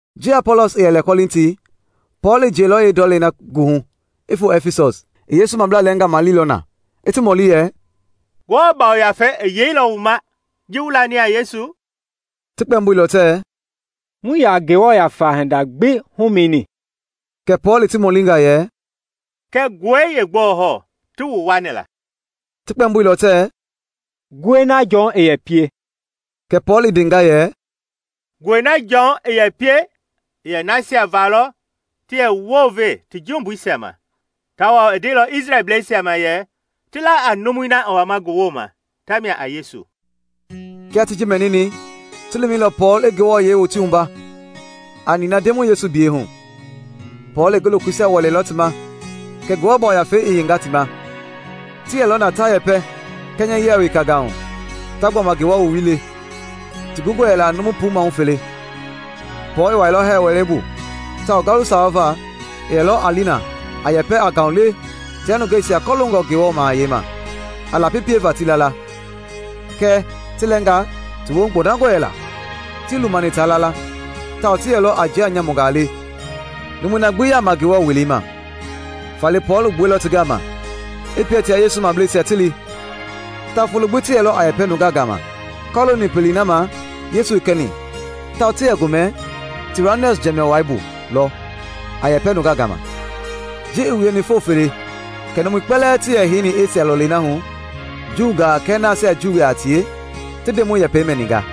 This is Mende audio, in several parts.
Ji Apɔlɔs i yɛ lɛ Kɔlinti, Pɔɔl i jiɛilɔ yeendɔlei na goohu i foo Ɛfisɔs. I Yesu mablaa lɛɛngaa maleilɔ na, i ti mɔli yɛ, “Ngewɔ Yafei i yeilɔ wu ma ji wu lani a Yesu?” Ti kpɛmboilɔ tɛɛ, “Muii yaa Ngewɔ Yafa hinda gbi humɛnini.” Kɛ Pɔɔl i ti mɔlinga yɛ, “Kɛ nguɛi yeegbɔɔ hɔɔ ti wu wuani la?” Ti kpɛmboilɔ tɛɛ, “Nguɛi na Jɔn i yɛ pie.” Kɛ Pɔɔl i ndenga yɛ, “Nguɛi na Jɔn i yɛ pie i yɛ nasia va lɔ ti yɛ wounve ti jumbuisia ma; tawao i ndeilɔ Isrɛlbleisia ma yɛ ti la a numui na i wama ngi wooma tamia a Yesu.” Kia ti ji mɛnini, ti lumɛilɔ Pɔɔl i ti wua a nina Ndemɔi Yesu biyɛi hu. Pɔɔl i ngi lokoisia wɛleilɔ ti ma kɛ Ngewɔ Yafei i yeinga ti ma; ti yɛlɔ na a yɛpɛ kɛnyɛyia wekangaa hu, ta gbɔma Ngewɔ Woowili le. Ti gungɔ yɛla a numu puu maahu fele. Pɔɔl i wuailɔ hɛɛ wɛlei bu tawao ngalu sawa va i yɛlɔ a li na a yɛpɛ a ngaulewe tia nungeisia kɔloongɔ Ngewɔ Mahayɛi ma, a lapi pieva ti la la. Kɛɛ ti lɛɛnga ti woohu gbɔndangɔ yɛla, tii lumani taa la la, tawao ti yɛlɔ a njia nyamungaa le numui na gbi yaama Ngewɔ Welei ma. Faale Pɔɔl i gbuɛilɔ ti gama, i pie tia Yesu mableisia ti li; tawao folo gbi ti yɛlɔ a yɛpɛ nunga gama kɔlooni pelei na ma Yesu i kɛni tawao ti yɛ gomɛ Tiranɔs jɛmɛɛ wai bu lɔ a yɛpɛ nungaa gama. Ji i wieni foo fele kɛ numui kpɛlɛɛ ti yɛ heini Esia lɔlei na hu, Juungaa kɛɛ nasia Juublaa yaa tie, ti Ndemɔi yɛpɛi mɛninga.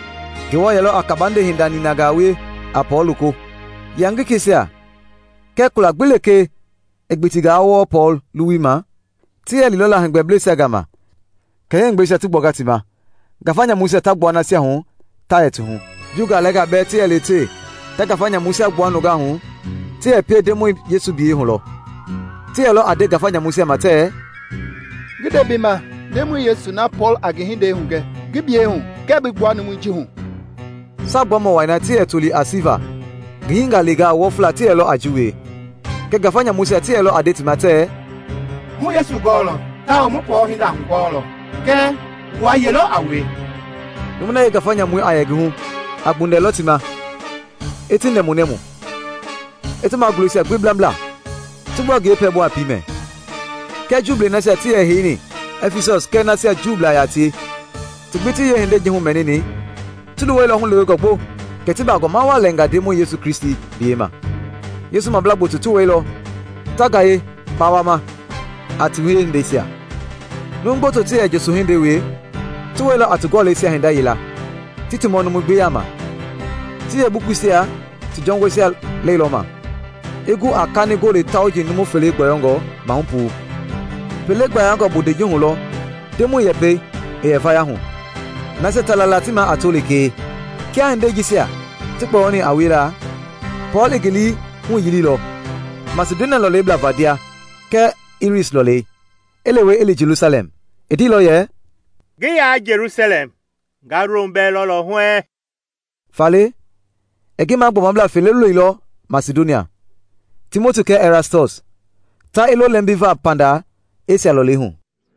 Ngewɔ yɛlɔ a kabande hinda ninangaa wie a Pɔɔl loko. Yangisɛisia kɛɛ kula gbi lekee i gbitingaa wɔɔ Pɔɔl luwui ma, ti yɛ lilɔ la heegbɛbleisia gama kɛ yeeheegbɛisia ti gbuanga ti ma, ngafa nyamuisia ta gbua nasia hu ta yɛ ti hu. Juungaa lɛɛnga bɛɛ ti yɛ lewetewe ta ngafa nyamuisia gbua nungaa hu ti yɛ pie Ndemɔi Yesu biyɛi hu lɔ. Ti yɛlɔ a nde ngafa nyamuisia ma tɛɛ, “Ngi nde bi ma Ndemɔi Yesu na Pɔɔl a ngi hindei hugɛ ngi biyɛi hu ngɛɛ bi gbua numui ji hu.” Saagbuamɔ wai na ti yɛ toli a Siva ngi hingaleengaa wɔfla ti yɛlɔ a ji wie. Kɛɛ ngafa nyamuisia ti yɛlɔ a nde ti ma tɛɛ, “Mu Yesu gɔɔlɔ tawao mu Pɔɔl hinda hugɔɔlɔ; kɛɛ wua ye lɔ a wue?” Numui na yee ngafa nyamui a yɛ ngi hu a gbundɛlɔ ti ma, i ti nɛmunɛmu, i ti magulɛisia gbi blambla, ti gbua ngi yee pɛlɛbu a piimɛ. Kia Juublei nasia ti yɛ heini Ɛfisɔs kɛɛ nasia Juublaa yaa tie ti gbi ti yee hindei ji humɛnini; ti luwɛilɔ hulewengɔ gbo, kɛ ti bagɔma waa lɛnga Ndemɔi Yesu Kristi biyei ma. Yesu mablaa gboto ti wɛilɔ, ta gaye kpawama a ti wiehindeisia. Numu gboto ti yɛ njoso-hindei wie, ti wɛilɔ a ti gɔlɛisia hinda yila, ti ti mɔ numui gbi yaama. Ti yeebukuisia ti jɔngɔi lɛilɔma, i gu a kani gole tauji numu fele gbɔyɔngɔ maahu puu. Pele gbayangɔ bondei ji hu lɔ Ndemɔi yɛpɛi i yɛ vaya hu, nasia ta la la ti maa a to lekee. Kia hindei jisia ti kpɔyɔni a wiela, Pɔɔl i ngi lii huyiliilɔ Masidonia lɔlei blava ndia kɛɛ lris lɔɔlɛi, i lewe i li Jelusalɛm. I ndeilɔ yɛ, “Ngi yaa Jelusalɛm, nga Rom bɛɛ lɔlɔ huɛɛŋ.” Faale i ngi magbɔmablaa fele loilɔ Masidonia, Timoti kɛɛ Ɛrastɔs, ta i lo lɛmbiva panda Esia lɔlei hu.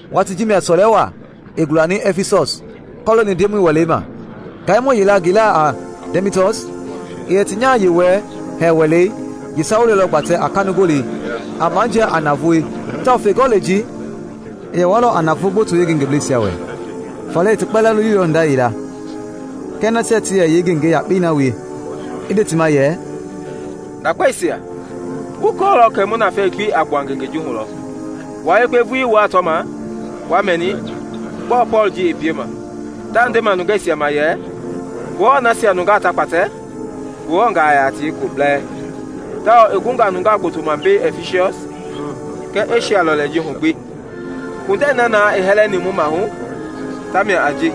Watii ji mia sɔlɛ waa i gulani Ɛfisɔs kɔlooni Ndemɔi Welei ma. Ngaimɔ yila ngi laa a Dɛmitɔs, i yɛ ti nyaha-yewɔɛi hɛɛ wɛlei yeesawulɛi lɔ gbatɛ a kanigolei a majia a navoei tawao feegɔlei ji i yɛ walɔ a naavoo gboto yeengengebleisia wɛ. Faale i ti kpɛlɛɛ lolilɔ hinda yila kɛɛ nasia ti yɛ yeengenge yakpei na wie, i nde ti ma yɛ, “Ndakpeisia, wu kɔɔlɔ kɛ mu nafɛi gbi a gbua ngengei ji hu lɔ. Wua yekpe vulii wuaa tɔma, wa mɛni, gbɔɔ Pɔɔl ji i piema. Taa ndema nungeisia ma yɛ ngewɔɛi nasia nungaa ta kpatɛ Ngewɔngaa yaa a tie kulo bɛɛ, tawao i gunga numu gboto ma mbei Ɛfisɔs kɛɛ Esia lɔlei ji hu gbi. Kpundɛi na na i hɛlɛni mu maahu tamia a ji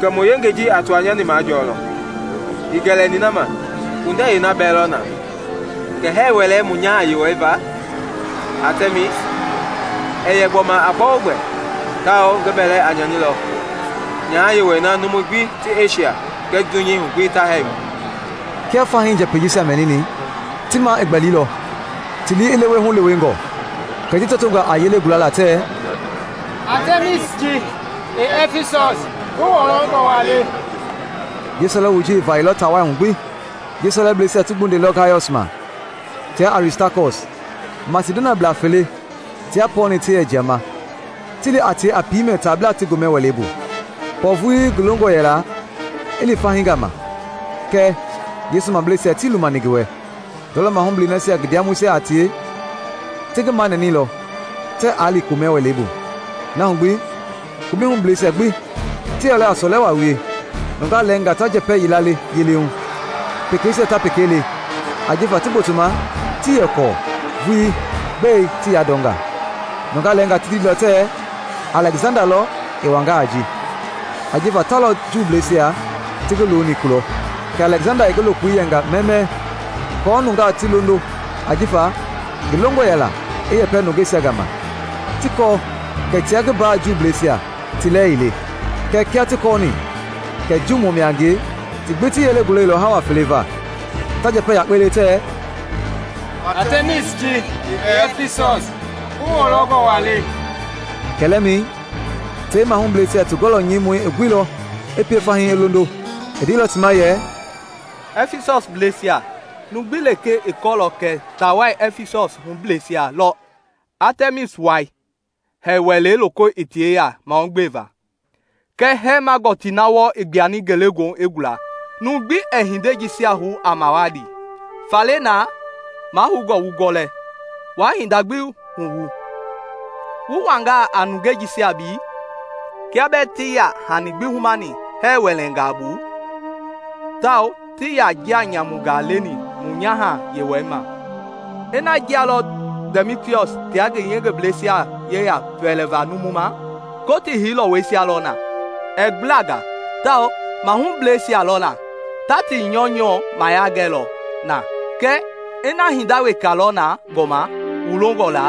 kɛ mu yengei ji a tɔwanyani majɔɔlɔ. Ii gɛlɛni na ma, kpundɛi yeena bɛɛ lɔ na kɛ hɛɛ wɛlei mu nyaha-yewɔɛi va, Atɛmis, ɛɛ yɛ gbɔma a gbɛogbɛ tawao ngi bɛlɛ a nyanilɔ nyaha-yewɔɛi na numui gbi ti Esia kɛɛ dunyei hu gbi ta hɛɛ ma!” Kia fahii njɛpɛi jisia mɛnini, ti maa i gbɛlilɔ, ti lii i lewe hulewengɔ, kɛ ti tɔtonga a yelei gulala tɛɛ, “Atɛmis ji i Ɛfisɔs ngi wɔlɔngɔ waa le!” Yeesɔlɛwoi ji i vayɛilɔ taa wai hu gbi. Yeesɔlɛbleisia ti gbundɛilɔ Gayɔs ma tia Aristakɔs, Masidoniablaa fele tia Pɔɔl-ni ti yɛ jiama, ti li a tie a piimɛ taablaa ti gomɛ wɛlei bu. Pɔɔl vulii ngi longɔ yɛla i li fahii gama kɛɛ Yesu mableisia tii lumani ngi wɛ. Ndɔlɔ mahublɛi nasia ngi ndiamɔisia a tie, ti ngi manɛnɛilɔ tɛɛ aa li komɛ wɛlei bu. Na hu gbi, komɛi hubleisia gbi ti yɛ sɔlɛ waa lɔ wie: nungaa lɛɛnga ta njɛpɛ yila le yele hu, pekeisia ta peka le, ajifa ti gbotoma tii yɛ kɔɔ vulii gbɛe ti yandɔnga. Nungaa lɛɛnga ti ndeilɔ tɛɛ Alɛksanda lɔ i wanga a ji, ajifa ta lɔ Juuisia ti ngi loni kulɔ. Kɛ Alɛksanda i ngi lokoi yɛnga mɛmɛɛ aako nungaa ti londo ajifa ngi longɔ yɛla i yɛpɛ nungeisia gama ti kɔɔ kɛ tia ngi mbaa Juuisia ti lɛɛ ii le. Kɛɛ kia ti kɔɔni kɛ Juumɔ mia a ngie, ti gbi ti yelei gulɛilɔ hawa fele va, ta njɛpɛ yakpei le tɛɛ, “Atɛmis ji i Ɛfisɔs ngi wɔlɔngɔ waa le!” Kɛlɛmɛi tei yeemahublɛisia ti gɔlɔ nyɛimɔi i guilɔ i pie fahii i londo. I ndeilɔ ti ma yɛ, “Ɛfisɔblɛisia! Numu gbi lekee i kɔɔlɔ kɛ taa wai Ɛfisɔs hubleisia lɔ Atɛmis wai hɛɛ wɛlei loko i ti yeya mahugbeva kɛɛ hɛɛma gɔtii na wɔɔ i gbuani ngelegoohu i gula. Numu gbi ɛɛ hindei jisia hou a mawali. Faale na mahoungɔ wu gɔlɛ, waa hinda gbi huwu. Wu wanga a nungei jisia mbei kia bɛɛ tii yaa hani gbi humani hɛɛ wɛlɛngaa bu tawao tii yaa njia nyamungaa leni mu nyaha-yewɔɛi ma. Ina njia lɔ Dɛmitɔs tia ngi yengebleisia yeya pɛlɛva numu ma, Kotii hei lɔwɔisia lɔ na, ɛɛ gbula nga tawao mahubleisia lɔ na; ta ti nyɔunyɔu mayia gɛlɔ na. Kɛɛ ina hinda weka lɔ na gbɔma wu longɔ la,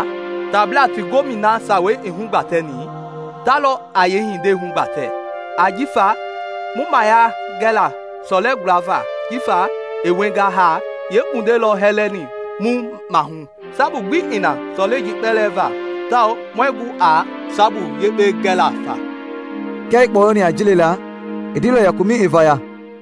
taablaa ti gomɛi na sawei i hugbatɛni, ta lɔ a yeehindei hugbatɛ. Ajifa mu mayia gɛla sɔlɛ gulava ji va i wienga haa yeekpundɛi lɔ hɛlɛni mu maahu. Sabu gbi ii na sɔlɛi ji kpɛlɛɛ va tawao muɛɛ gu a sabu yekpe gɛla faa.” Kia i kpɔyɔni a ji lela, i ndeilɔ yɛ komɛi i vaya.